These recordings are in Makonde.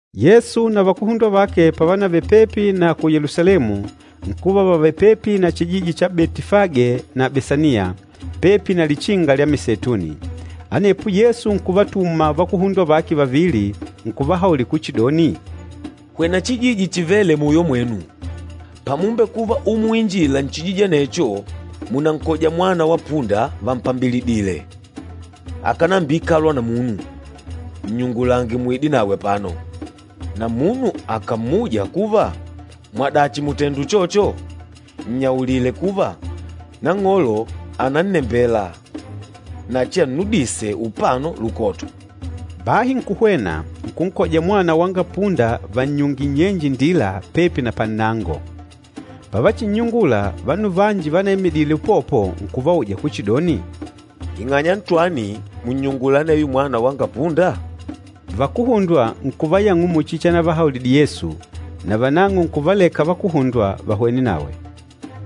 Yesu na vakuhundwa vake pávanavele pepi na ku Yelusalemu, nkuva vavèlè pepi na chijiji cha Betifage na Besaniya, pepi na Lichinga lya Miseituni. Anepo Yesu nkuvatuma vakuhundwa vake vavili, nkuvahaulila kuchidoni, “Hwena chijiji chivêle muyo mwenu. Pamumbekuva umuinjila nchijiji anecho, munankoja mwana wa punda vampambilidìlè, akánambiikalwa na munu. Nnyungulange muide nawe apano. Na munu akàmmuja kuva, ‘Mwadachi mùtenda uchocho?’ Nnyaulile kuva, ‘Nang'olo ànannembela na achiannudise upano lukoto.’” Bahi nkuhwena, nkunkoja mwana wanga punda vannyungìlè nnyenje indila pepi na pannango. Pavachinnyungula, vanu vanji vanaimidîle upopo nkuvauja kuchidoni, “Ing'anya ntwani mùnnyungula aneyo mwana wanga punda?” Vakuhundwa nkuvayang'ula muchi chanavahaulidile Yesu na vanang'o nkuvaleka vakuhundwa vahwene nawe.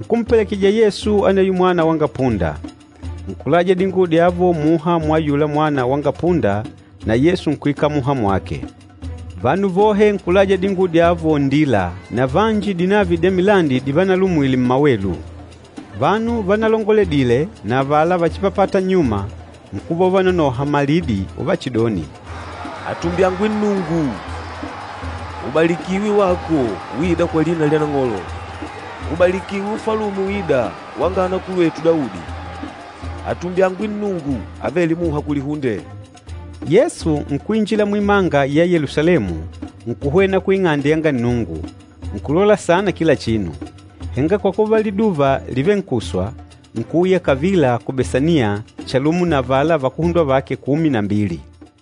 Nkumpelekejija Yesu aneyo mwana wanga punda. Nkulaja dinguwo dyavo muha mwa ayula mwana wanga punda na Yesu nkuikala muha mwake. Vanu vohe nkulaja dinguwo dyavo nndila, na vanji dinavi dya milandi divanalumwile mmawelu. Vanu vanalongoledile na avala váchipapàtà nnyuma, nkuva uvanonoha malidi uvachidoni, “Atumbyangwe Nnungu! Ubalikiwe wako uîda kwa lina lya Nang'olo! Ubalikiwe ufalume uîda wanga anakulwetu Daudi. Atumbyangwe Nnungu avêle muha kulihunde!” Yesu nkuinjila muimanga ya Yelusalemu nkuhwena ku Ing'ande yanga Nnungu, nkulola saana kila chinu. Henga kwa kuva liduva lìvenkuswa, nkuuya kavila ku Besaniya chalumo na avala vakuhundwa vake kumi na mbili.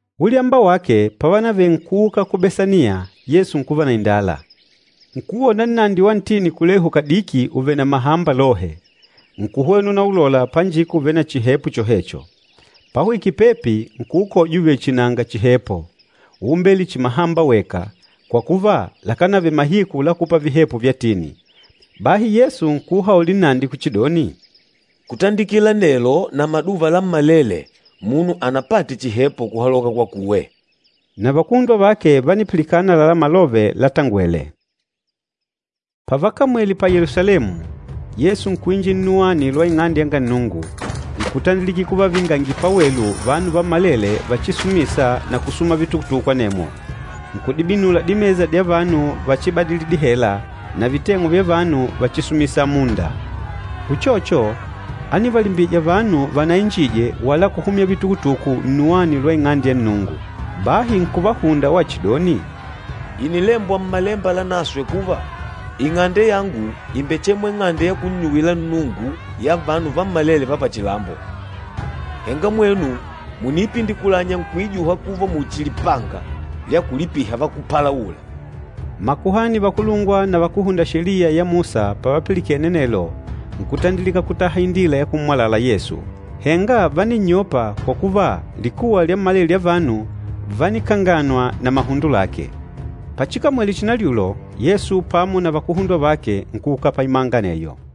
Ulyamba wake, pávanavele nkuuka ku Besaniya, Yesu nkuva na indala. Nkuwona nnandi wa ntini kulehu kadiki ùvele na mahamba lohe. Nkuhwena unaulola panjika ùvele na chihepo chohecho. Pahwikile pepi, nkuukoja uvèlè chihi nanga chihepo, úumbele chihi mahamba weka, kwa kuva lakánavele mahiku la kupa vihepo vya tini. Bahi Yesu nkuuhaulila nnandi kuchidoni, “Kutandikila nelo na maduva lammalele munu anapate chihepo kuhaloka kwakuwe.” Na vakuhundwa vake vánipilikana àlalá malove latangwele. Pavakamwele pa Yelusalemu, Yesu nkuinjila nnuwani lwa Ing'ande yanga Nnungu, nkutandilika kuvavingangila pawelu vanu vammalele váchisumìsà na kusuma vitukutuku, anemwo. Nkudibinula dimesa dya vanu váchibadìlì dihela, na viteng'u vya vanu váchisumìsà amunda. Uchocho, ánivalimbija vanu vanainjije wala kuhumya vitukutuku nnuwani lwa Ing'ande ya Nnungu. Bahi nkuvahunda wachidoni, “Ìnilembwa Mmalemba Lanaswe kuva, ‘Ing'ande yangu ìmbechemwa ing'ande ya kunnyuwila Nnungu ya vanu vammalele va pachilambo!’ Henga mwenu mùniipindikulanya nkuijuha kuva muchi lipanga lya kulipiha vakúpalaula!” Makuhani vakulungwa na vakúhunda Sheliya ya Musa pavapilikene anelo, nkutandilika kutaha indila ya kummwalala Yesu. Henga váninnyopa kwa kuva likuwa lyammalele lya vanu vánikanganwa na mahundo lake. Pachikamwele chinalyulo, Yesu pamo na vakuhundwa vake nkuuka paimanga aneyo.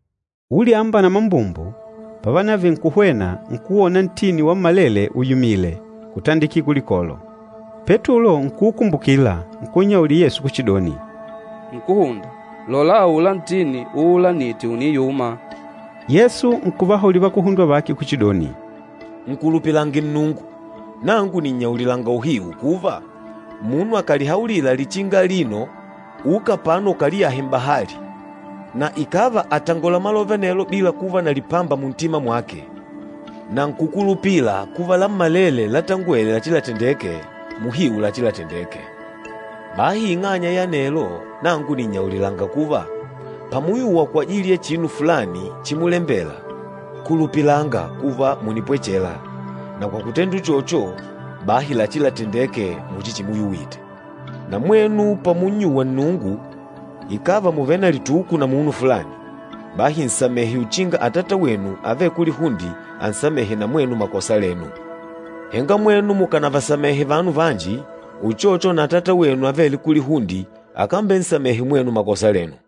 Ulyamba na mambumbu, pávanavele nkuhwena, nkuwona ntini wammalele uyumìlè, kutandikila kulikolo. Petulo nkuukumbukila, nkunnyaulila Yesu kuchidoni, “Nkúhunda, lola aula ntini uulanîte ùniyuma!” Yesu nkuvahaulila vakuhundwa vake kuchidoni, “Nkulupilange Nnungu. Nangu nìnnyaulilanga uhiu kuva, munu akàlihaulila lichinga alino, ‘Uka apano ukaliyahe m'bahali,’ na ikàva àtangola malove anelo bila kuva na lipamba muntima mwake, na nkùkulupila kuva lammalele látangwèlè lachilatendeke, muhiu lachilatendeke. Bahi ing'anya ya anelo, nangu nìnnyaulilanga kuva, pamuyuwa kwajili ya chinu fulani chimulembela, kulupilanga kuva mùnipwechela, na kwa kutenda uchocho bahi lachilatendeke muchi chimuyuwite. Na mwenu pamunnyuwa Nnungu, ikàva mùvele na lituku na munu fulani, bahi nsamehe uchinga Atata wenu avêle kulihunde ansamehe na mwenu makosa lenu. Henga mwenu mukanavasamehe vanu vanji, uchocho na Atata wenu avêle kulihunde akambensamehe mwenu makosa lenu.”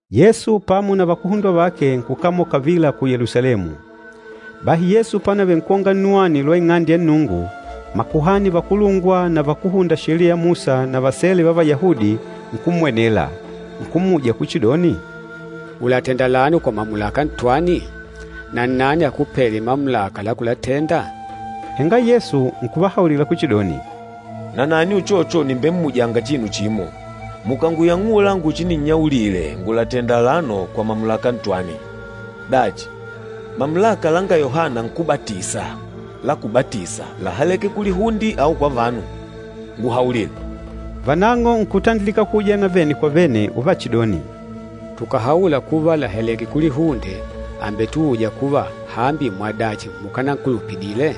Yesu pamo na vakuhundwa vake nkukamola kavila ku Yelusalemu. Bahi Yesu pánavele nkwonga nnuwani lwa Ing'ande ya Nnungu, makuhani vakulungwa na vakúhunda Sheliya ya Musa na vasele va Vayahudi, nkummwenela. Nkummuja kuchidoni, “Ùlatenda alano kwa mamulaka ntwani? Na nnani akupêle mamulaka la kulatenda?” Henga Yesu nkuvahaulila kuchidoni, “Nanani uchocho nìmbemmujanga chinu chimo. Mukànguyang'ula nguchininnyaulile, ngùlatenda alano kwa mamulaka ntwani. Dachi, mamulaka langa Yohana Nkúbatisa la kubatisa láhaleke kulihunde au kwa vanu? Nguhaulile.” Vanang'o nkutandilika kuujana vene kwa vene uvachidoni, “Tukàhaula kuva, làhaleke kulihunde, àmbetuuja kuva, ‘Hambi, mwadachi mukánankulupidile?’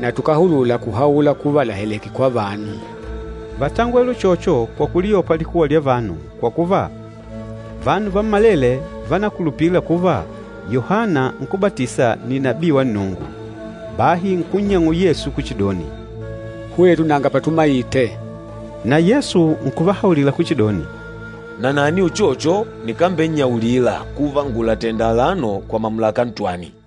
Na tukáhulula kuhaula kuva làhaleke kwa vanu.” Vátangwele uchocho kwa kuliyopa likuwa lya vanu, kwa kuva, vanu vammalele vánakulupila kuva Yohana Nkúbatisa ni nabii wa Nnungu. Bahi nkunnyang'ula Yesu kuchidoni, “Hwetu nanga patumaite.” Na Yesu nkuvahaulila kuchidoni, “Nanani uchocho nikambennyaulila kuva ngùlatenda alano kwa mamulaka ntwani.”